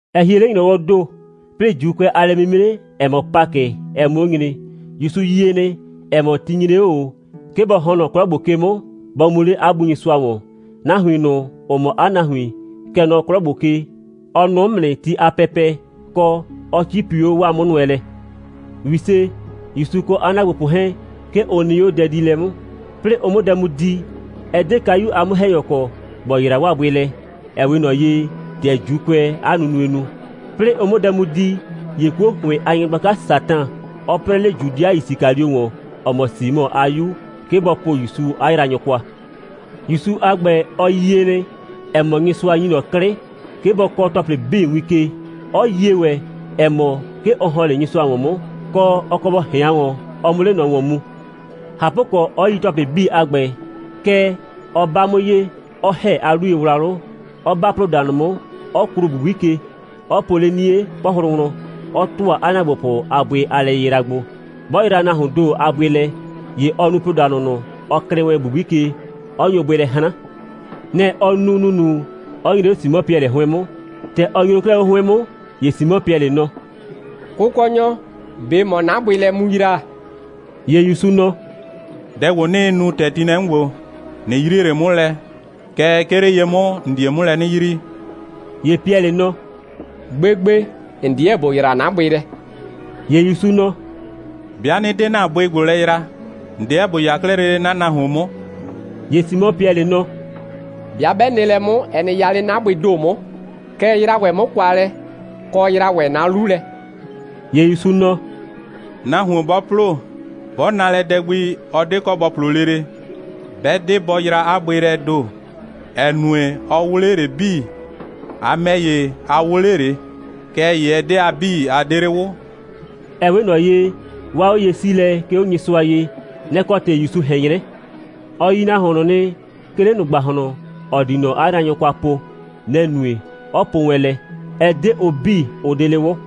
Ɛ hie 'le ‑nyrɔwɔɔ ‑do, 'plɩɩ ‑Juukʋɛ a lɛ'mimre, ‑ɛ mɔ Pakɩ, ɛ 'mʋ 'o nyre. ‑Yusu yie nɩ, ‑ɛ mɔ, ti nyre 'o ꞊o, 'ke bɔ ‑hɔn nɔ 'klɔ ‑gbo ke 'mʋ, bɔ mu 'le 'a Bu Nyɩsʋa ‑wɔn. Nahuin ꞊nʋ, ‑ʋ mɔ 'a nahuin, kɛ nɔ 'klɔ ‑gbo ke, ɔ nʋʋ 'mʋ nɩ ti a pɛpɛ, kɔ, ɔ 'cipi 'o 'waa 'mʋnʋɛlɛ. ‑Wise, ‑Yusu kɔ 'a ‑naagbopʋ 'hɛɛn, 'ke ʋ nɩ 'o dɛdiilɛ 'mʋ. 'Plɩɩ ʋ 'mʋ dɛ mu di, ɛ 'de kayu a 'mʋ‑hɛnyɔ kɔ, ‑bɔ yra 'waa bʋɩ lɛ, ‑ɛ 'we ꞊nɔ ye, ‑tɛ ‑Juukʋɛɛ 'a nunue nu. 'Plɩɩ ʋ 'mʋ dɛ mu di, ‑ye 'kuo ‑hʋɩn a nyɩgblaka Satan, ɔ 'prɛɛ 'le Judɩa Yisikalio ‑wɔn, ‑ɔ mɔ Simɔ a 'yu, 'ke bɔ po ‑Yusu 'a yraanyʋ kwa. ‑Yusu a ‑gbɛ, ɔ yie nɩ, ‑ɛ mɔ, Nyɩsʋa ‑nyi ꞊nɔ 'klɩ, 'ke bɔ kɔɔ ‑tɔplɩ 'bii win ke, 'ɔ yie ‑wɛ, ‑ɛ mɔ, 'ke ɔ ‑hɔn 'le Nyɩsʋa ‑wɔn 'mʋ, kɔ, 'ɔ kɔ bɔ ꞊hɩan ‑wɔn, ɔ 'mʋ 'le ꞊nɔ ‑wɔn mu. ꞊Hapʋkɔ, 'ɔ yi ‑tɔplɩ 'bii a ‑gbɛ, kɛɛ, ɔ 'ba 'mʋ ye, 'ɔ ‑hɛ 'a 'luyewlawlʋ, 'ɔ 'ba ‑ploodanʋ 'mʋ, 'ɔ kluu ‑bubui ke, 'ɔ po 'le 'nie 'pɔhlʋ wlɔn, 'ɔ ‑tʋa 'a ‑naagbopʋ a bʋɩ a lɛyɩyra gbo. 'Bɔ yra nahuoon ‑do a bʋɩ lɛ, ‑ye ɔ nu ‑ploodanʋ ꞊nʋ, ɔ klɩɩ wɛn ‑bubui ke, 'ɔ nyo bʋɩ lɛ 'hran. Nɛ‑ ɔ nu ‑nunu, 'ɔ nyre 'o Simɔ Piɛlɩ 'hʋɩn 'mʋ. ‑Tɛ ɔ nyro 'klɛɛ 'o 'hʋɩn 'mʋ, ‑ye Simɔ Piɛlɩ nɔ: «Kʋkɔnyɔ, ꞊be ‑mɔɔ 'na bʋɩ lɛ mu yra?» ‑Ye ‑Yusu nɔ: «Dɛ ‑gbo, 'nɩɩ nu, ‑tɛ ti nɩ lɛ 'mʋ ‑gbo, ꞊nɩ yrie ꞊le 'mʋ lɛ, kɛɛ, 'ke 'le ye 'mʋ, ‑n die 'mʋ lɛ 'nɩ yrii.» ‑Ye Piɛlɩ nɔ: «Gbegbe, ‑n 'deɛ ‑bo yra 'na bʋɩ lɛ.» ‑Ye ‑Yusu nɔ: «'Bɩa 'nɩ 'de ‑na bʋɩ ‑gbo lɛ yra, ‑n 'deɛ ‑bo 'ya 'klɛɛ lele 'na nahuon 'mʋ.» ‑Ye Simɔ Piɛlɩ nɔ: «'Bɩa 'bɛ nɩ lɛ 'mʋ, ɛ nɩ 'ya 'le 'na bʋɩɩ ‑do 'mʋ, kɛɛ, yra ‑wɛ 'mʋ kwa lɛ, kɔ, yra ‑wɛ 'na 'lu lɛ.» ‑Ye ‑Yusu nɔ: «Nahuon 'bɔ ‑plo, 'bɔ na lɛ dɛ gbi, ɔ 'de kɔ bɔ ‑plo lele, 'bɛ 'de bɔ yra 'a bʋɩ lɛɛ ‑do, ‑ɛ nue, ɔ 'wʋ 'le ꞊le 'bii. A ‑mɛ ‑ye, a 'wʋ 'le ꞊le. Kɛɛ ‑ye ɛ 'de a 'bii, a 'de 'le 'wʋ.» Ɛ 'we ꞊nɔ ye, 'waa 'oye'siilɛ, 'ke 'o Nyɩsʋa ye, nɛ‑ kɔ ‑tɩ ‑Yusu ꞊hɛn 'nyrɛ. Ɔ yi nahuon ꞊nʋ nɩ, 'ke 'le ꞊nʋ ‑gbahlɔn, ‑ɔ di ꞊nɔ 'a yraanyʋ kwa po. Nɛ‑ nue, 'ɔ po wɛn lɛ: «Ɛ 'de ʋ 'bii, ʋ 'de 'le 'wʋ.»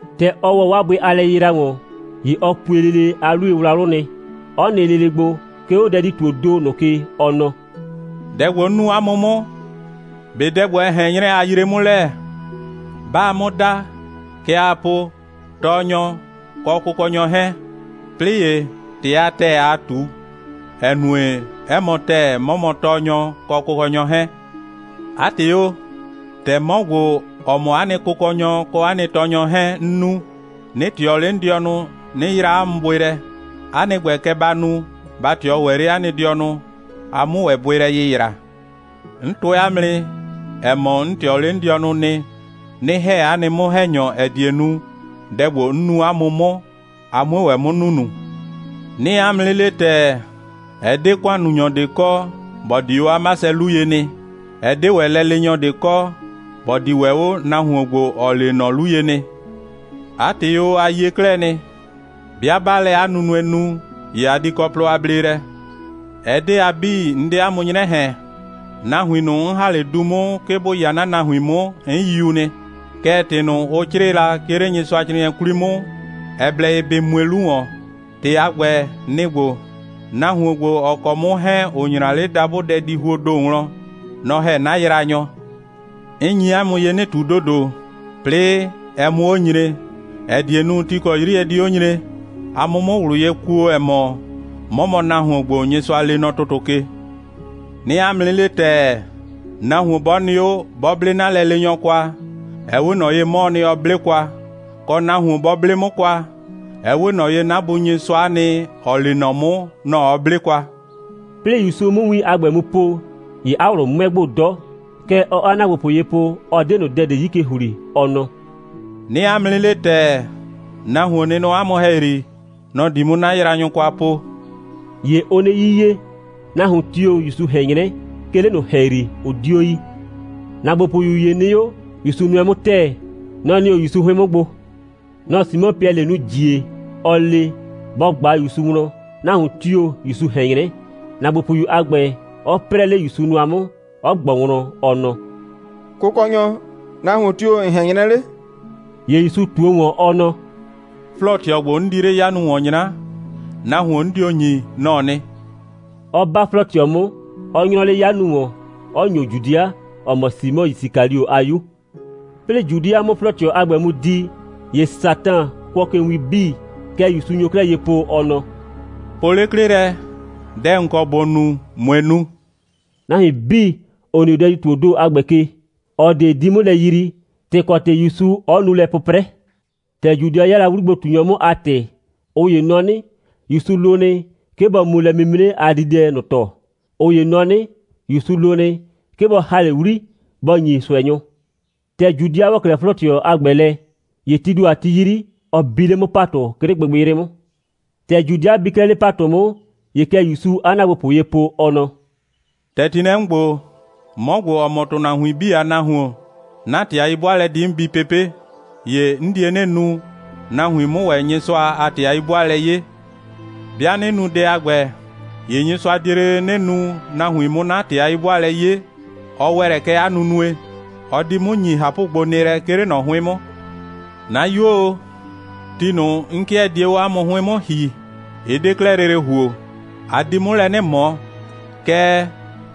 ‑Tɛ ɔ ‑wɔ 'waa bʋɩ a lɛyɩyra ‑wɔn, ‑ye ɔ pue lele 'a 'luyewlawlʋ nɩ, 'ɔ nɩ lele gbo, 'ke 'o dɛdi‑tuoo ‑do ꞊nʋ ke, ɔ nɔ: «Dɛ ‑gbo, 'n nu 'a mʋ 'mʋ, ꞊be dɛ ‑gbo, ɛ ꞊hɛn 'nyrɛ, a yree 'mʋ lɛ? 'Baa 'mʋ da, kɛ aa po: Tɔɔnyɔ kɔ Kʋkɔnyɔ 'hɛɛn. 'Plɩɩ ‑ye, ‑tɩ a ‑tɛɛ aa ꞊tu, ‑ɛ nue, 'ɛ mɔ ‑tɛɛ, 'mɔ mɔ Tɔɔnyɔ, kɔ Kʋkɔnyɔ 'hɛɛn. 'A ‑tɩ o, ‑tɛ 'mɔ ‑gbo, ‑ɔ mɔ 'a nɩ Kʋkɔnyɔ kɔ 'a nɩ Tɔɔnyɔ 'hɛɛn, 'n nu, 'nɩ ꞊tɩɔ 'le 'n dɩɔnʋ, 'nɩ yra 'a mʋ bʋɩ lɛ, 'a nɩ ‑gbɛ, kɛ ba nu, ba ꞊tɩɔ ‑wɛ 'le 'a nɩ dɩɔnʋ, a 'mʋ ‑wɛ bʋɩ lɛ yɩyra. 'N tʋɛ 'a mʋ nɩ, ‑ɛ mɔ, 'n ꞊tɩɔ 'le 'n dɩɔnʋ nɩ, 'nɩ ‑hɛ 'a nɩ 'mʋ‑hɛnyɔ, ‑ɛ die nu, dɛ ‑gbo, 'n nu 'a mʋ 'mʋ, a 'mue ‑wɛ 'mʋ nunu. 'Nɩɩ 'a mʋ 'nɩ le ‑tɛɛ, ɛ 'de ‑kʋannunyɔ ꞊de kɔ, ‑bɔ di 'o 'a 'masɛ 'lu ye nɩ. Ɛ 'de ‑wɛ lɛleenyɔ ꞊de kɔ, ‑bɔ di ‑wɛ 'o nahuon ‑gbo, ‑ɔ lee ꞊nɔ 'lu ye nɩ. 'A ‑tɩ o, a yie 'klɛɛ nɩ. 'Bɩa 'baa lɛ 'a nunue nu, ‑ye a di kɔ plɔ a bleelɛ. Ɛ 'de a 'bii, 'n 'de 'a mʋ 'nyrɛ ꞊hɛn. Nahuin ꞊nʋ, 'n ‑ha 'le du 'mʋ, 'ke bʋ 'ya 'na nahuin 'mʋ, 'n yiu nɩ. Kɛɛ, ‑tɩ ꞊nʋ, ʋ 'crɩɩ la, 'ke 'le Nyɩsʋacrɩɩnɩɛ 'kwli 'mʋ, ɛ blɛ ye bɩ mue 'lu ‑wɔn. ‑Tɩ a ‑gbɛ, nɩ‑ ‑gbo: Nahuon ‑gbo, ‑ɔ kɔ 'mʋ 'hɛɛn, ‑ʋ 'nyra 'le dabʋ dɛdihuoo ‑do wlɔn, nɔ‑ ‑hɛ 'na yraanyɔ. 'N nyi 'a mʋ ye 'nɩ ꞊tu ‑dodo, 'plɩɩ ɛ 'mʋ 'o nyre, ‑ɛ die nu, ti ‑kɔ 'yri ɛ di 'o nyre, a 'mʋ 'mʋ ꞊wlʋ ye kuo, ‑ɛ mɔ, 'mɔ mɔ nahuon ‑gbo, Nyɩsʋa lee nɔ ‑tʋtʋ ke. 'Nɩɩ 'a mʋ 'nɩ le ‑tɛɛ, nahuon 'bɔ nɩ 'o, 'bɔ 'ble 'na lɛleenyɔ kwa, ɛ 'we ꞊nɔ ye, 'mɔɔ nɩ, ɔ 'ble kwa. Kɔ, nahuon 'bɔ 'ble 'mʋ kwa, ɛ 'we ꞊nɔ ye, 'na Bu Nyɩsʋa'a nɩ, ‑ɔ lee 'mʋ, nɔ‑ ɔ 'ble kwa.» 'Plɩɩ ‑Yusu 'mʋ win a ‑gbɛ mu po, ‑ye 'a ꞊wlʋ 'mʋɛ gbo 'dɔ. Kɛ ɔɔ 'a ‑naagbopʋ ye po, ɔ 'de ꞊nʋ dɛ ꞊de 'yi ke ‑hli, ɔ nɔ: «'Nɩɩ 'a mʋ 'nɩ le ‑tɛɛ, nahuon nɩ nɔ 'a mʋ ‑hɛyri. Nɔ‑ di 'mʋ 'na yraanyʋ kwa po.» ‑Ye ʋʋ 'nɩ 'yiye. Nahuon tio‑ ‑Yusu ꞊hɛn 'nyrɛ, 'ke 'le ꞊nʋ ‑hɛyri, ʋ 'dio yi. ‑Naagbopʋyu ‑ye nɩ 'o, ‑Yusu nʋɛ 'mʋ ‑tɛɛ, nɔ‑ nɩ 'o ‑Yusu 'hʋɩn 'mʋ gbo. Nɔ‑ Simɔ Piɛlɩ nu ‑jie, ɔ le, bɔ ꞊gba ‑Yusu wlɔn, nahuon tio‑ ‑Yusu ꞊hɛn 'nyrɛ, ‑naagbopʋyu a ‑gbɛ 'ɔ 'prɛɛ 'le ‑Yusu nʋa 'mʋ, 'ɔ ꞊gbɔ wlɔn, ɔ nɔ: «Kʋkɔnyɔ, nahuon tio‑ ‑n ꞊hɛn 'nyrɛ 'le?» ‑Ye ‑Yusu ꞊tuo ‑wɔn, ɔ nɔ: «'Flɔɔ꞊tɩɔ ‑gbo, 'n di 'le 'yanu ‑wɔn 'nyra, nahuon, 'n dio ‑nyi, nɔ‑ɔ nɩ,» 'ɔ 'ba 'flɔɔ꞊tɩɔ 'mʋ, 'ɔ 'nyrɔ 'le 'yanu ‑wɔn, 'ɔ ‑nyo Judɩa, ‑ɔ mɔ Simɔ Yisikalio a 'yu. 'Plɩɩ Judɩa 'mʋ 'flɔɔ꞊tɩɔ a ‑gbɛ mu di, ‑ye Satan kʋɔ ke win 'bii. Kɛ ‑Yusu nyo 'klɛɛ ye po, ɔ nɔ: «Po 'le 'klɩ lɛ, dɛ ‑n kɔ ‑bo nu, ꞊mue nu!» Nahuin 'bii, ‑ʋ nɩ 'o dɛdi‑tuoo ‑do a ‑gbɛ ke, ꞊ɔ ꞊de 'di 'mʋ lɛ yrii, ‑tɩ kɔ ‑tɩ ‑Yusu 'ɔ nu lɛ 'pʋprɛ. ‑Tɛ Judɩa 'ya la 'wligbo꞊tunyɔ 'mʋ a ‑tɩ, ꞊ʋ ‑ye nɔ 'nɩ, ‑Yusu lo nɩ, 'ke bɔ mu lɛ'mimre a dididɛ ꞊nʋ ‑tɔ, ꞊ʋ ‑ye nɔ 'nɩ, ‑Yusu lo nɩ, 'ke bɔ ‑ha 'le 'wli, bɔ ‑nyi ꞊sʋɛnyʋ. ‑Tɛ Judɩa ‑wɔ 'klɛɛ 'flɔɔ꞊tɩɔ a ‑gbɛ lɛ, ‑ye tii ‑do a ti 'yri, ɔ bi 'le 'mʋ ‑patʋ, 'ke 'le gbɩgbɩyrɩ 'mʋ. ‑Tɛ Judɩa bi 'klɛɛ 'le ‑patʋ 'mʋ, ‑ye kɛ ‑Yusuu 'a ‑naagbopʋ ye po, ɔ nɔ: «‑Tɛ ti nɩ lɛ 'mʋ ‑gbo, 'mɔ ‑gbo, ‑ɔ mɔ ‑tʋnahuin 'bii a Nahuon, 'na ‑tɩ a 'yi'bʋaalɛ di 'mʋ bi pepe'. ‑Ye 'n die 'nɩ nu, nahuin 'mʋ ‑wɛ Nyɩsʋa a ‑tɩ a 'yi'bʋaalɛ 'ye. 'Bɩa 'nɩ nu dɛ a ‑gbɛ, ‑ye Nyɩsʋa die lele 'nɩ nu, nahuin 'mʋ 'na ‑tɩ a 'yi'bʋaalɛ 'ye. Ɔ ‑wɛ lɛ kɛ 'a nunue. Ɔ di 'mʋ ‑nyi ꞊hapʋgbonɩɩlɛ, 'ke 'le ꞊nɔ 'hʋɩn 'mʋ. 'Na 'yuo o, ti ꞊nʋ, 'n 'kɩɛ die 'o 'a mʋ 'hʋɩn 'mʋ ‑hi, ɩ 'de 'klɛɛ lele ‑huo. A di 'mʋ lɛ 'nɩ ꞊mɔ. Kɛɛ,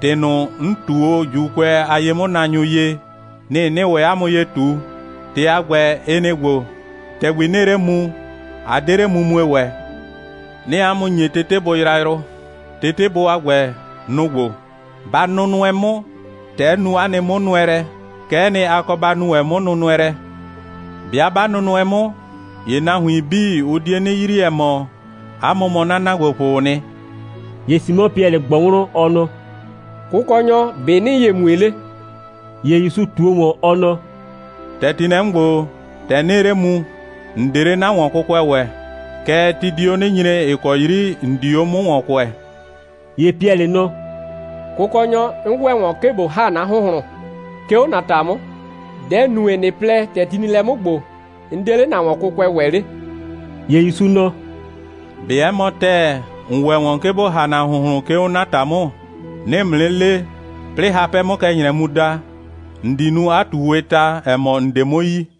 ‑tɩ ꞊nʋ, 'n ꞊tu o ‑Juukʋɛ a ye'mʋnaanyʋ ye, nɩ‑ 'nɩɩ ‑wɛ 'a mʋ ye mu ꞊tu. ‑Tɩ a ‑gbɛ, ɩ nɩ‑ ‑gbo: ‑Tɛgbi 'nɩɩ 'le mu, a 'de 'le mumue ‑wɛ. 'Nɩɩ 'a mʋ ‑nye tetebʋ yrayrʋ. Tetebʋ a ‑gbɛ, nʋ‑ ‑gbo: Ba nʋnʋɛ 'mʋ. ‑Tɛ 'n nu 'a nɩ 'mʋnʋɛlɛ, kɛ'ɛ nɩ, a kɔ ba nu ‑wɛ 'mʋnʋnʋɛlɛ. 'Bɩa 'ba nʋnʋɛ 'mʋ, ‑ye nahuin 'bii, ʋ die 'nɩ yrii, ‑ɛ mɔ, 'a mʋ mɔ 'na ‑naagbopʋʋ nɩ.» ‑Ye Simɔ Piɛlɩ ꞊gbɔ wlɔn, ɔ nɔ: «Kʋkɔnyɔ, ‑be' ‑nɩɩ ye mue 'le?» ‑Ye ‑Yusu ꞊tuo ‑wɔn, ɔ nɔ: «‑Tɛ ti nɩ lɛ 'mʋ ‑gbo, ‑tɛgbi 'nɩɩ 'le mu, ‑n 'de 'le 'na ‑wɔnkʋkʋɛ ‑wɛ. Kɛɛ, ti di 'o 'nɩ nyre, ‑ɩ kɔ 'yri ‑n di 'o 'mʋ ‑wɔn kʋɛɛ.» ‑Ye Piɛlɩ nɔ: «Kʋkɔnyɔ, 'n ‑wɛ ‑wɔn, 'ke ꞊bo ‑ha 'na ‑hʋnhlʋn, 'ke 'o ‑na ‑ta 'mʋ. Dɛ‑ nue, ꞊nɩ plɛ, ‑tɛ ti nɩ lɛ 'mʋ ‑gbo, 'n 'de 'le ‑na ‑wɔnkʋkʋɛ ‑wɛ 'le?» ‑Ye ‑Yusu nɔ: «꞊Be 'ɛ mɔ ‑tɛɛ, ‑n ‑wɛ ‑wɔn, 'ke ‑bo ‑ha ‑na ‑hʋnhlʋn, 'ke 'o 'na ‑ta 'mʋ? 'Nɩɩ ‑mʋ 'nɩ le, 'plɩɩ hapɛ 'mʋ kɛ ‑nyrɛ mu da, ‑n di nu 'a ꞊tuuwɩɩ ta, ‑ɛ mɔ, ‑n 'de 'mʋ yi.»